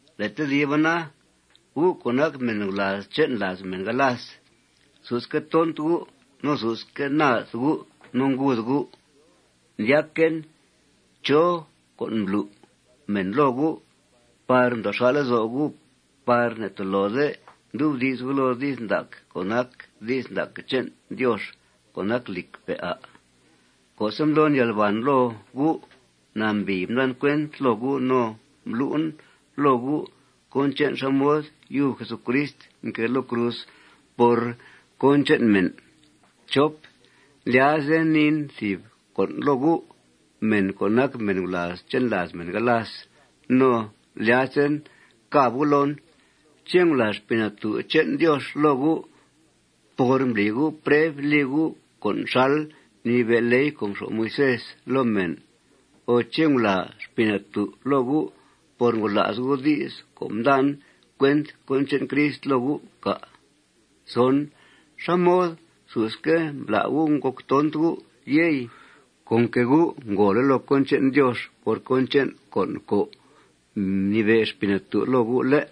Le' tediba na, gu' co' nac mèn gulàaz che'n làaz mèn galas, susque' tont gu' no susque' naad gu' no nguud gu', ndyaquen. ¿Chó con' mblu' mèn loo gu' par ndoo xà' lezo' gu' par ne'tolode ndubdi's gu' loo di's ndac co' nac di's ndac che'n Diox co' nac lìcque', à'? Co'se' mblon yalbàn loo gu', nambìi mdan cuent loo gu' no mblu'en loo gu' cón che'n xá mod yub Jesucrist mquée loo cruz por cón che'n mèn. Ndlyazen niin thìb con' loo gu', mèn co' nac mèn gulàaz che'n làaz mèn galas no lyazen càb gu' loon: ¿Ché' ngulàa Xpii Natú' che'n Diox loo gu' por mbli gu' preb li gu' con' xal mnibe' ley co' mxo'f Moisés loo mèn o ché' ngulàa Xpii Natú' loo gu' por ngola's gu' di's co' mdan cuent cón che'n Crist loo gu', cà'? ¿Xá mod susque' mbla' gu' ngòc tont gu', yey? Con que gu' ngòole' loo cón che'n Diox por cón che'n con' co' mnibe' Xpii Natú' loo gu', ¿lé'?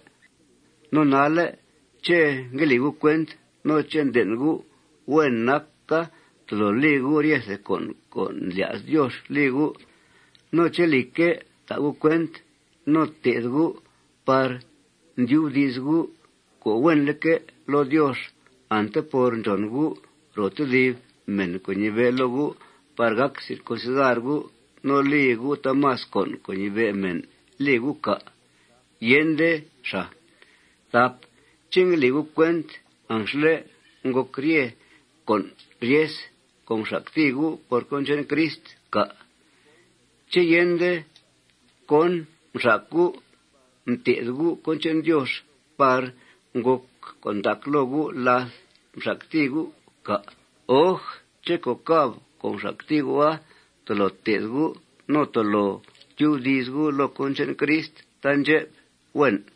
no nalle', ¿ché' ngue li gu' cuent no ché' nden' gu' huen naca tolo li gu' ryethe con' co' ndlya's Diox li gu', no ché', lìcque', ta' gu' cuent no té'th gu' par ndyubdi's gu' co' huenleque' loo Diox ante por ndxòn gu' ro tedib mèn co' ñibe' loo gu' par gàc circuncidar gu' no li gu' taamas con' co' ñibe' mèn li gu', cà'? Yende xàa. ¿Ché' ngue li gu' cuent anxle' ngòc rye con' ryes co' mxactìi gu' por cón che'n Crist, cà'? ¿Ché' yende cón mxac gu' mté'th gu' cón che'n Diox par ngòc con' ndac loo gu' láth mxactìi gu', cà'? Oj, ché' co' càb co' mxactìi gu'a tolo té'th gu' no tolo tyubdi's gu' loo cón che'n Crist taandxep. Huen.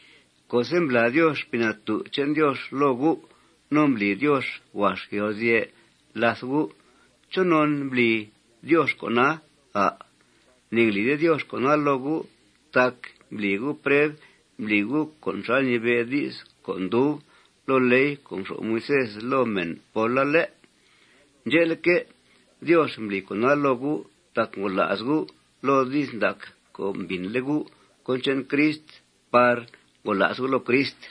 Co'se' mblàa Diox Xpii Natú' che'n Diox loo gu' no mbli Diox huax yalguzye' làth gu', ¿chonon mbli Diox con'a, à'? Ne'nglide Diox con'a loo gu' tac mbli gu' preb mbli gu' con' xal ñibe' di's co' ndub loo ley co' mxo'f Moisés loo mèn póla, ¿lé'? Ndxe'leque', Diox mbli con'a loo gu' tac ngola's gu' loo di's ndac co' mbìnle' gu' cón che'n Crist par ngola's gu' loo Crist.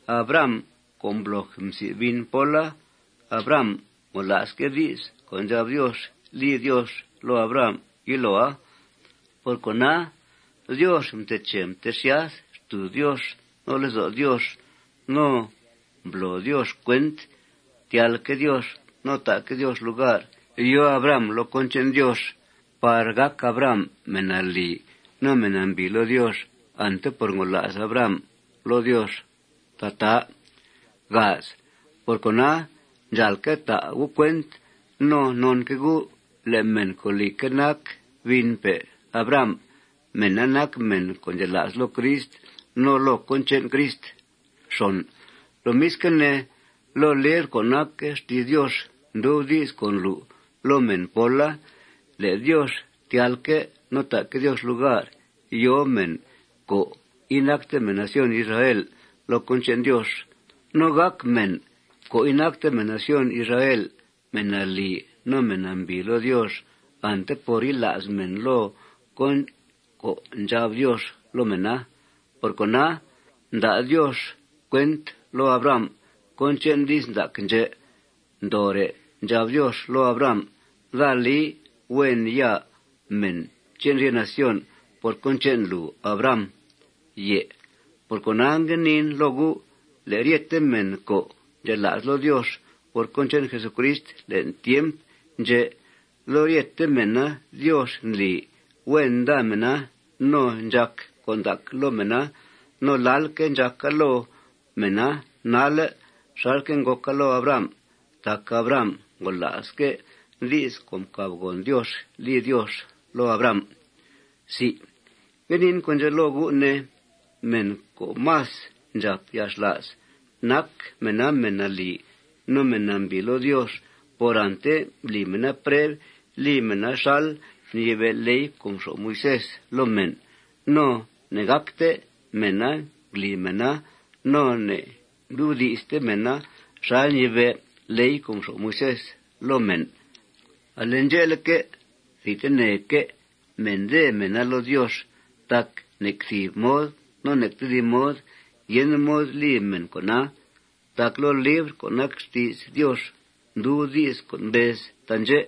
Abraham, co' mbloj msi' bin póla, Abraham ngola'sque' di's co' ndxab Diox li Diox loo Abraham yiloa. Por cona, Diox mteche mtexyath xtùuz Diox no lezo' Diox. No mblo Diox cuent tyalque' Diox no ta'que' Diox lugar yòo Abraham loo cón che'n Diox par gàc Abraham mèn nalì no mèn nambìi loo Diox ante por ngola's Abraham loo Diox tataa. Por cona, ndxàalque' ta' gu' cuent no nonque' gu' le' mèn co', lìcque', nac binpe' Abraham, mèna nac mèn co' ndxela's loo Crist no loo cón che'n Crist. Lomisque' ne, loo libr co' nac xti's Diox ndub di's co' mblu' loo mèn póla le' Diox tyalque' no ta'que' Diox lugar yòo mèn co' inacte mèn nación Israel loo cón che'n Diox. No gàc mèn co' inacte mèn nación Israel mèn nalì no mèn nambìi loo Diox ante por yila's mèna loo con' co' ndxab Diox loo mèna. Por cona, mda' Diox cuent loo Abraham cón che'n di's ndac ndxè' ndoore'. Ndxab Diox loo Abraham: Daa li huen ya mèn che'n rye nación por cón che'n lùu, Abraham. Por cona, ngue niin loo gu': Le' ryete mèn co' ndxela's loo Diox por cón che'n Jesucrist le'n tiemp ndxè', loo ryete mèna Diox ndli huen nda mèna no ndxàc con' ndac loo mèna. No lalque' ndxàca loo mèna nalle' xalque' ngòca loo Abraham tac Abraham ngola'sque' di's co' mcàbgòn Diox li Diox loo Abraham. Ngue niin con' ndxè' loo gu', ne: Mèn co' más ndxàp yalxla's nac mèna mèn nalì no mèn nambìi loo Diox por ante mbli mèna preb li mèna xal mnibe' ley co' mxo'f Moisés loo mèn, no ne'ngácte mèna ngli mèna no ne'ngdubdi'ste mèna xal ñibe' ley co' mxo'f Moisés loo mèn, ale ndxe'leque', thidteneque' mèndèe mèna loo Diox tac nec thìb mod no nec tedib mod yende mod li mèn con'a. Tac loo libr co' nac xti's Diox ndub di's co' mbez taandxè':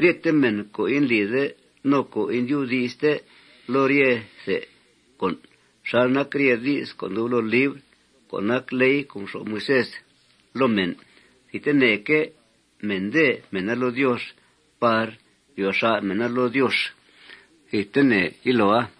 Ryete mèn co' indlide no co' indubdi'ste loo ryethe con' xal nac rye di's co' ndub loo libr co' nac ley co' mxo'f Moisés loo mèn, thidteneque' mèndèe mèna loo Diox par ryo xa' mèna loo Diox thidtene yiloa.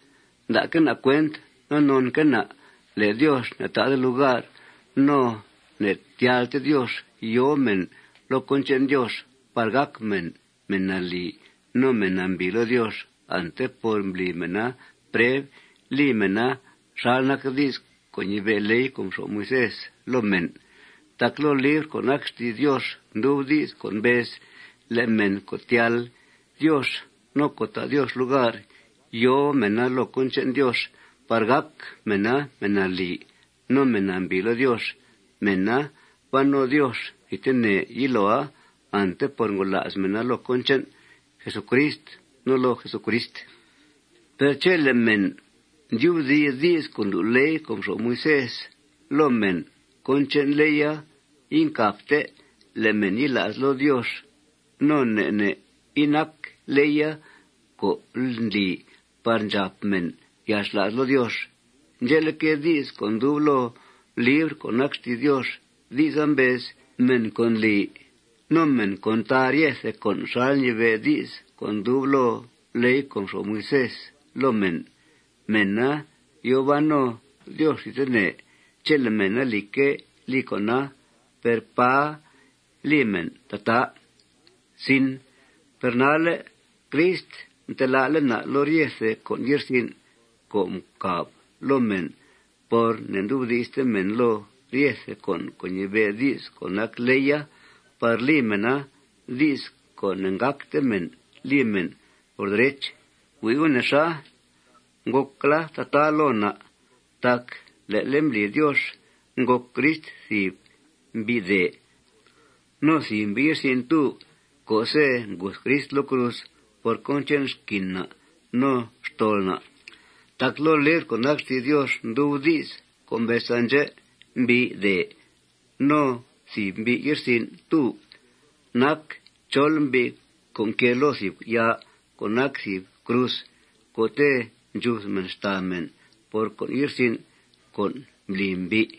Nda'que' na' cuent no nonque' na' le' Diox ne'ta'de lugar no ne'tyalte Diox yòo mèn loo cón che'n Diox par gàc mèn mèn nalì no mèn nambìi loo Diox ante por mbli mèna preb li mèna xal nac di's co' ñibe' ley co' mxo'f Moisés loo mèn. Tac loo libr co' nac xti's Diox ndub di's co' mbez: Le' mèn co' tyal Diox no co' ta' Diox lugar yòo mèna loo cón che'n Diox par gàc mèna mèn nalì no mèn nambìi loo Diox, mèna ban no Diox thidtene yiloa ante por ngola's mèna loo cón che'n Jesucrist no loo Jesucrist. Per chele' mèn ndyubdi's di's co' ndlu' ley co' mxo'f Moisés loo mèn, cón che'n leya incàbte le' mèn yila's loo Diox. No ne' ne' inac leya co' ndli par ndxàp mèn yalxla's loo Diox. Ndxe'leque', di's co' ndub loo libr co' nac xti's Diox, di'sa mbez: Mèn co' ndli no mèn co' ntaa ryethe con' xal ñibe' di's co' ndub loo ley co' mxo'f Moisés loo mèn, mèna yòo ban no Diox thidtene chele' mèn, lìcque', li con'a. Per ¡pà li mèn tataa! Per nalle', Crist mtelá'le' na' loo ryethe con' ye'rsin' co' ncàb loo mèn por ne'ndubdi'ste mèn loo ryethe con' co' ñibe' di's co' nac leya par li mèna, di's co' ne'gácte mèn li mèn, por derech. Hui' gu' nexa. Ngòcla tataa loo na' tac le'le' mbli Diox ngòc Crist thìb mbi'dèe no thìb mbi' ye'rsin'túb co'se' nguth Crist loo cruz por cón che'n xquin na' no xtol na'. Tac loo libr co' nac xti's Diox ndub di's co' mbez taandxè': Mbi'dèe no thìb mbi' ye'rsin'túb nac chol mbi' co' nquée loo thìb yaa co' nac thìb cruz co'te' ndxuth mèn xtàa mèn por con' ye'rsin' co' mbli mbi'.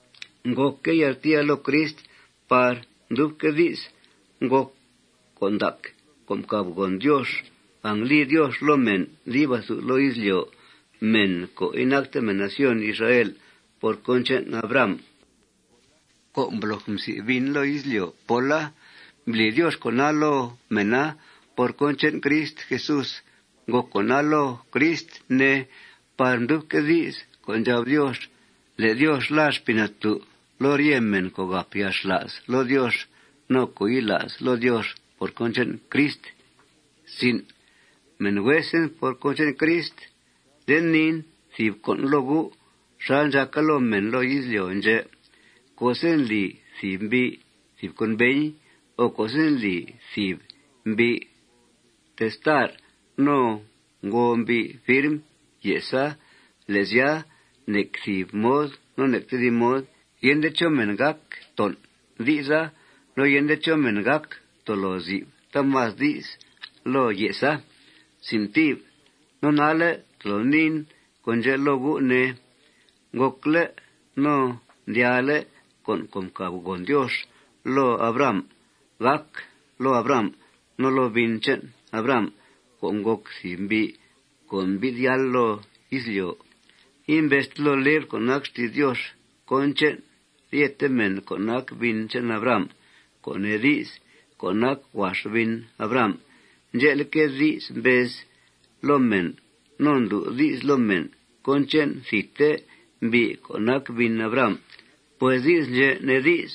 Ngòcque' yaltìia loo Crist par mdubque' di's ngòc con' ndac co' mcàbgòn Diox angli Diox loo mèn dib athu loo izlyo', mèn co' inacte mèn nación Israel, por cón che'n Abraham co' mbloj msi' bin loo izlyo' póla. Mbli Diox con'a loo mèna por cón che'n Crist Jesús. Ngòc con'a loo Crist, ne, par mdubque' di's co' ndxab Diox le' Diox làa Xpii Natú' loo rye mèn co' gàp yalxla's loo Diox no co' yila's loo Diox por cón che'n Crist. Mèn huesen por cón che'n Crist, nde niin thìb con' loo gu' xal ndxàca loo mèn loo izlyo' ndxè': Co'se' ndli thìb mbi' thìb conveñ o co'se' ndli thìb mbi' testar no ngo mbi' firm ye'sa, le' sya, nec thìb mod no nec tedib mod yende chó mèn gác ton' di'sa no yende chó mèn gác tolo zi'f taamas di's loo ye'sa. No nalle' tolo niin con' ndxè' loo gu', ne: Ngòcle' no mdyaale' con' co' mcàbgòn Diox loo Abraham gàc loo Abraham no loo bin che'n Abraham co' ngòc thìb mbi' co' mbi'th yáal loo izlyo'. Imbezte loo libr co' nac xti's Diox cón che'n ryete mèn co' nac bin che'n Abraham, co' nee di's, co' nac huax bin Abraham. Ndxe'leque', di's mbez loo mèn no ndlu' di's loo mèn cón che'n thidte mbi' co' nac bin Abraham. Pues di's ndxè' nee di's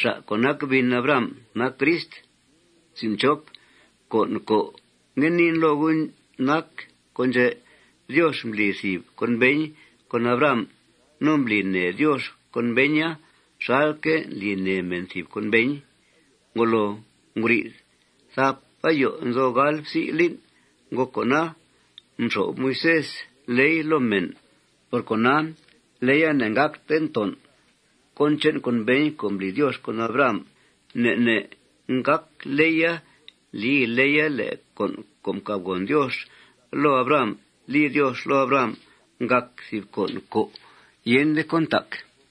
xa' co' nac bin Abrahama nac Crist. Con' co' ngue niin loo gu' nac con' ndxè': Diox mbli thìb conveñ con Abraham. No mbli nèe Diox conveña xalque' ndli nèe mèn thìb conveñ. Ngolo nguri'th thap ayo nzo gal psi' lín' ngòc con'a, mxo'f Moisés ley loo mèn. Por cona, leya ne'ngácte ngton' cón che'n conveñ co' mbli Diox con Abraham. Ne' ne' ngác ley li ley le' con' co' mcàbgòn Diox loo Abraham li Diox loo Abraham ngàc thìb con' co' yende cón ntac.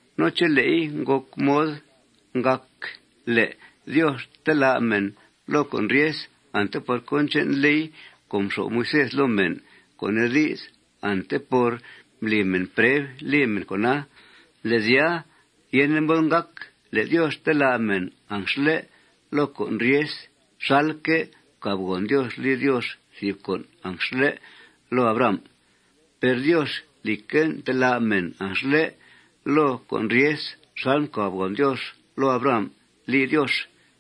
No chele'i ngo mod ngàc le' Diox telá' mèn loo con' ryes ante por cón che'n ley co' mxo'f Moisés loo mèn, co' nee di's, ante por mbli mèn preb li mèn con'a, le' sya, yende mod ngàc le' Diox telá' mèn anxle' loo con' ryes xalque' mcàbgòn Diox li Diox thìb con' anxle' loo Abraham. Per Diox, lìcque', ntelá' mèn anxle' loo con' ryes xal mcàbgòn Diox loo Abraham li Diox.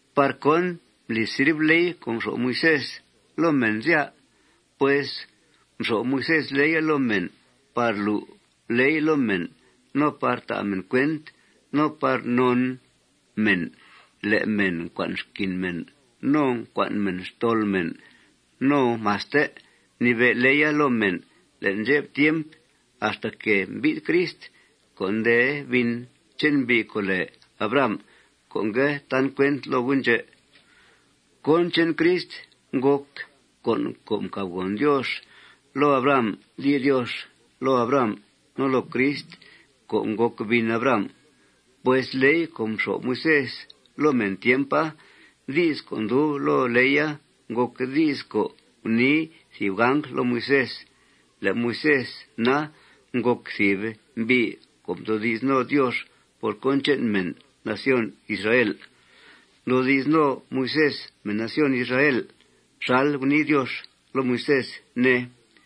¿Par cón mbli sirv ley co' mxo'f Moisés loo mèn, sya? Pues mxo'f Moisés leya loo mèn par lu' ley loo mèn no par ta' mèn cuent no par non mèn le' mèn ncua'n xquin mèn no ncua'n mèn xtol mèn. No maste mnibe' leya loo mèn le'n ndxep tiemp axtaque' mbi'th Crist co' nde bin che'n mbi' co' lèe Abraham co' ngue tan cuent loo gu' ndxè'. Cón che'n Crist ngòc con' co' mcàbgòn Diox loo Abraham li Diox loo Abraham no loo Crist co' ngòc bin Abraham. Pues ley co' mxo'f Moisés loo mèn tiempa, di's co' ndub loo leya ngòc di's co' gunii thìb angl loo Moisés. Le' Moisés na, ngòc thìb mbi' co' mdoodi's no Diox por cón che'n mèn nación Israel. Mdoodi's no Moisés mèn nación Israel xal gunii Diox loo Moisés, ne.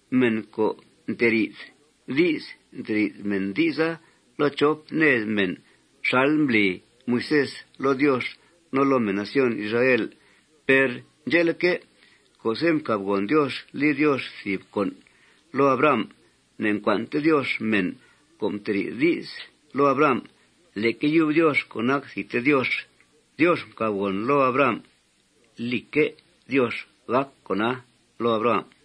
Mèn co' nteri'th di's, nteri'th mèn di'sa loo chop ned mèn xal mbli Moisés loo Diox no loo mèn nación Israel. Per ndxe'leque', co'se' mcàbgòn Diox li Diox thìb con' loo Abraham, ne'ncua'nte Diox mèn co' mteri'th di's loo Abraham. Leque yub Diox co' nac thidte Diox, Diox mcàbgòn loo Abraham lique' Diox gàc con'a loo Abraham.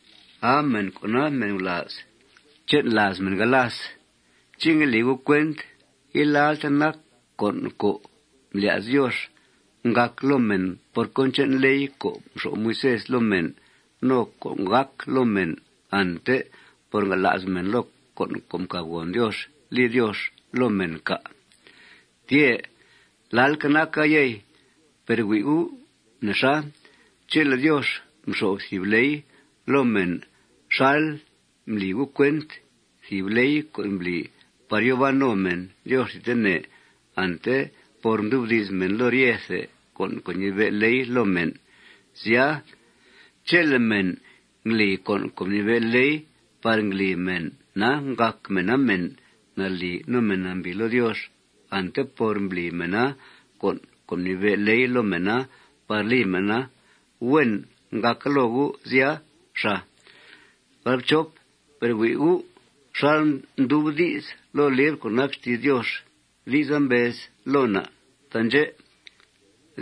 ¡Aa mèn co' nac mèn gulàaz che'n làaz mèn galas! ¿Ché' ngue li gu' cuent ilalte nac con' co' mblya's Diox ngàc loo mèn por cón che'n ley co' mxo'f Moisés loo mèn no con' co' gàc loo mèn ante por ngola's mèn loo con' co' mcàbgòn Diox li Diox loo mèn, cà'? Tyè'. Lalque' naca, yey. Per hui' gu' nexa. Chele Diox mxo'f thìb ley loo mèn xal ndli gu' cuent, thìb ley co' ndli par yòo ban no mèn Diox thidtene ante por ndubdi's mèn loo ryethe con' co' ñibe' leya loo mèn, sya, chele' mèn ndli con' co' mnibe' ley par ngli mèna ngàc mèna mèn nalì no mèn nambìi loo Diox ante por mbli mèna con' co' mnibe' ley loo mèna par li mèna, huen ngàca loo gu', sya, xàa. Per hui' gu' xal ndub di's loo libr co' nac xti's Diox. Di'sa mbez loo na' taandxè':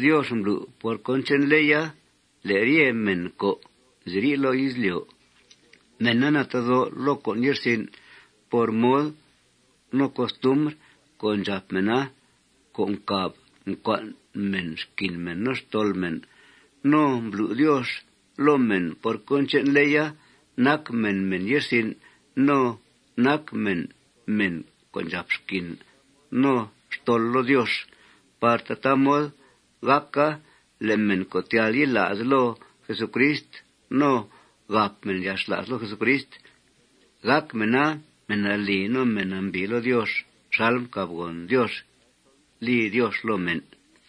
―Diox mblu' por cón che'n leya le' ryete mèn co' nziri' loo izlyo', mèna natedó' loo con' ye'rsin' por mod no costumbr co' ndxàp mèna co' ncàb ncua'n mèn xquin mèn no xtol mèn. No mblu' Diox loo mèn por cón che'n leya nac mèn mèn ye'rsin' no nac mèn mèn co' ndxàp xquin no xtol loo Diox par tataa mod gàca le' mèn co' tyal yila's loo Jesucrist no gàp mèn yalxla's loo Jesucrist, gàc mèna mèn nalì no mèn nambìi loo Diox xal mcàbgòn Diox li Diox loo mèn.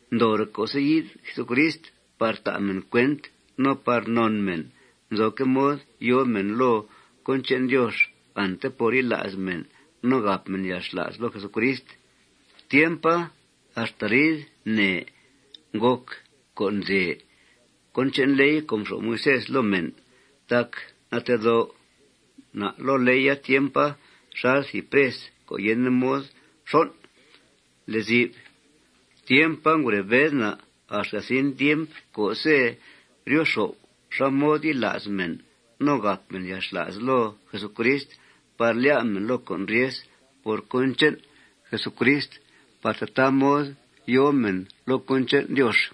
Ndoore' co'se' yi'th Jesucrist par ta' mèn cuent no par non mèn nzoque' mod yòo mèn loo cón che'n Diox ante por yila's mèn no gàp mèn yalxla's loo Jesucrist, tiempa axta arid nèe ngòc con'dèe cón che'n ley co' mxo'f Moisés loo mèn. Tac natedó' na' loo leya tiempa xal thìb pres co' yende mod xon' lezi'f. Tiempa, ngure bed na' axta zin tiemp co'se' ryo xo'f xá mod yila's mèn no gàp mèn yalxla's loo Jesucrist par lyá' mèn loo con' ryes por cón che'n Jesucrist par tataa mod yòo mèn loo cón che'n Diox.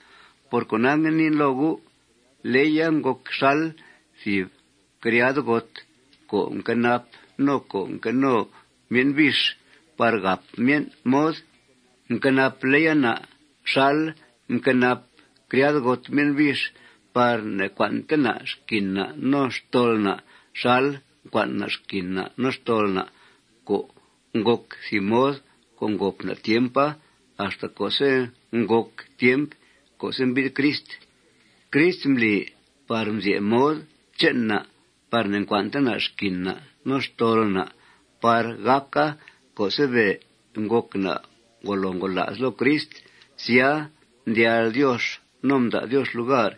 Por cona, ngue niin loo gu': Leya ngòc xal thìb criadgot co' nquenap no co' nqueno myen' bix par gàp myen' mod. Mquenap leya na' xal mquenap criadgot myen' bix par ne'ncua'nte na' xquin na' no xtol na' xal mcua'n na' xquin na' no xtol na' co' ngòc thìb mod co' ngòp na' tiempa axta co'se' ngòc tiemp co'se' mbi'th Crist. Crist mbli par mzye' mod che'n na' par ne'ncua'nte na' xquin na' no xtol na' par gàca co'se' be' ngòc na' ngolo ngola's loo Crist, sya, mdyal Diox no mda' Diox lugar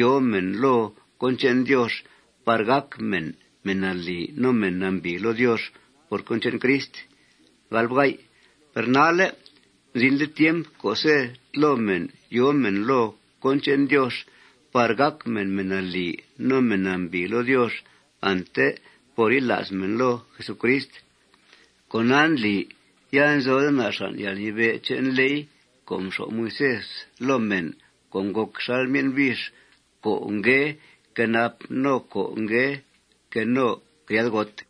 yòo mèn loo cón che'n Diox par gàc mèn mèn nalì no mèn nambìi loo Diox por cón che'n Crist. Per nalle', mzinle' tiempa co'se' tlo mèn yòo mèn loo cón che'n Diox par gàc mèn mèn nalì no mèn nambìi loo Diox ante por yila's mèn loo Jesucrist. Con'a ndli ya inzode na' xàn' yalnibe' che'n ley co' mxo'f Moisés loo mèn co' ngòc xal myen' bix co' ngue quenap no ngue queno criadgot.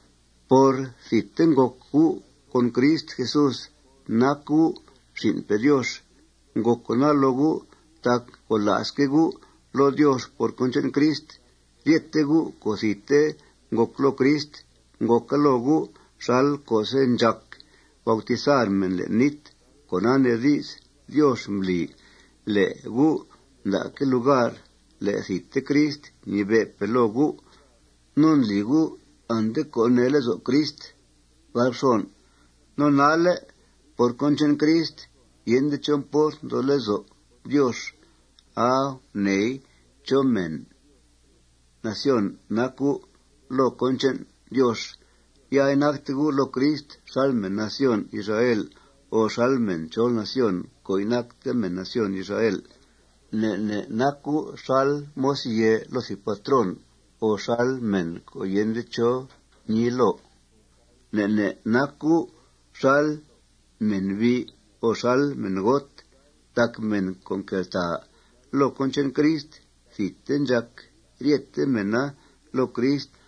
Por thidte ngòc gu' con Crist Jesús nac gu' xin'pe' Diox. Ngòc con'a loo gu' tac ngola'sque' gu' loo Diox por cón che'n Crist. Ryete gu' co' thidte ngòc loo Crist, ngòca loo gu' xal co'se' ndxàc bautizar mèn le'n nít. Con'a nee di's Diox mbli le' gu' nda'que' lugar le' thidte Crist ñibe'pe' loo gu'. No ndli gu' ante co' nee lezo' Crist. No nalle' por cón che'n Crist, yende chó mport nzo lezo' Diox aa guneei chó mèn nación nac gu'. Loo cón che'n Diox ya inacte gu' loo Crist xal mèn nación Israel ó xal mèn chol nación co' inacte mèn nación Israel. Ne' ne' nac gu' xal moz yèe loo thìb patrón ó xal mèn co' yende chó ñii loo. Ne' ne' nac gu' xal mènbi' o xal mèngot. Tac mèn co' nqueltàa loo Crist thidte ndxàc ryete mèna loo Crist.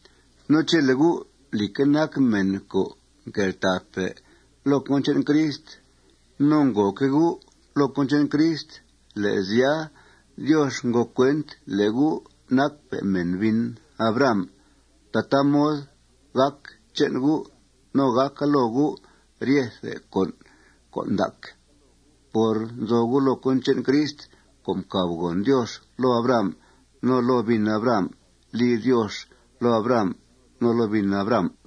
No chele' gu', lìcque', nac mèn co' nqueltàape' loo cón che'n Crist no ngòoque' gu' loo cón che'n Crist, le' sya, Diox ngo cuent le' gu' nacpe' mèn bin Abraham. Tataa mod gàc che'n gu' no gàc loo gu' ryethe con' ndac por nzo gu' loo cón che'n Crist, co' mcàbgòn Diox loo Abraham no loo bin Abraham li Diox loo Abraham no loo bin Abraham.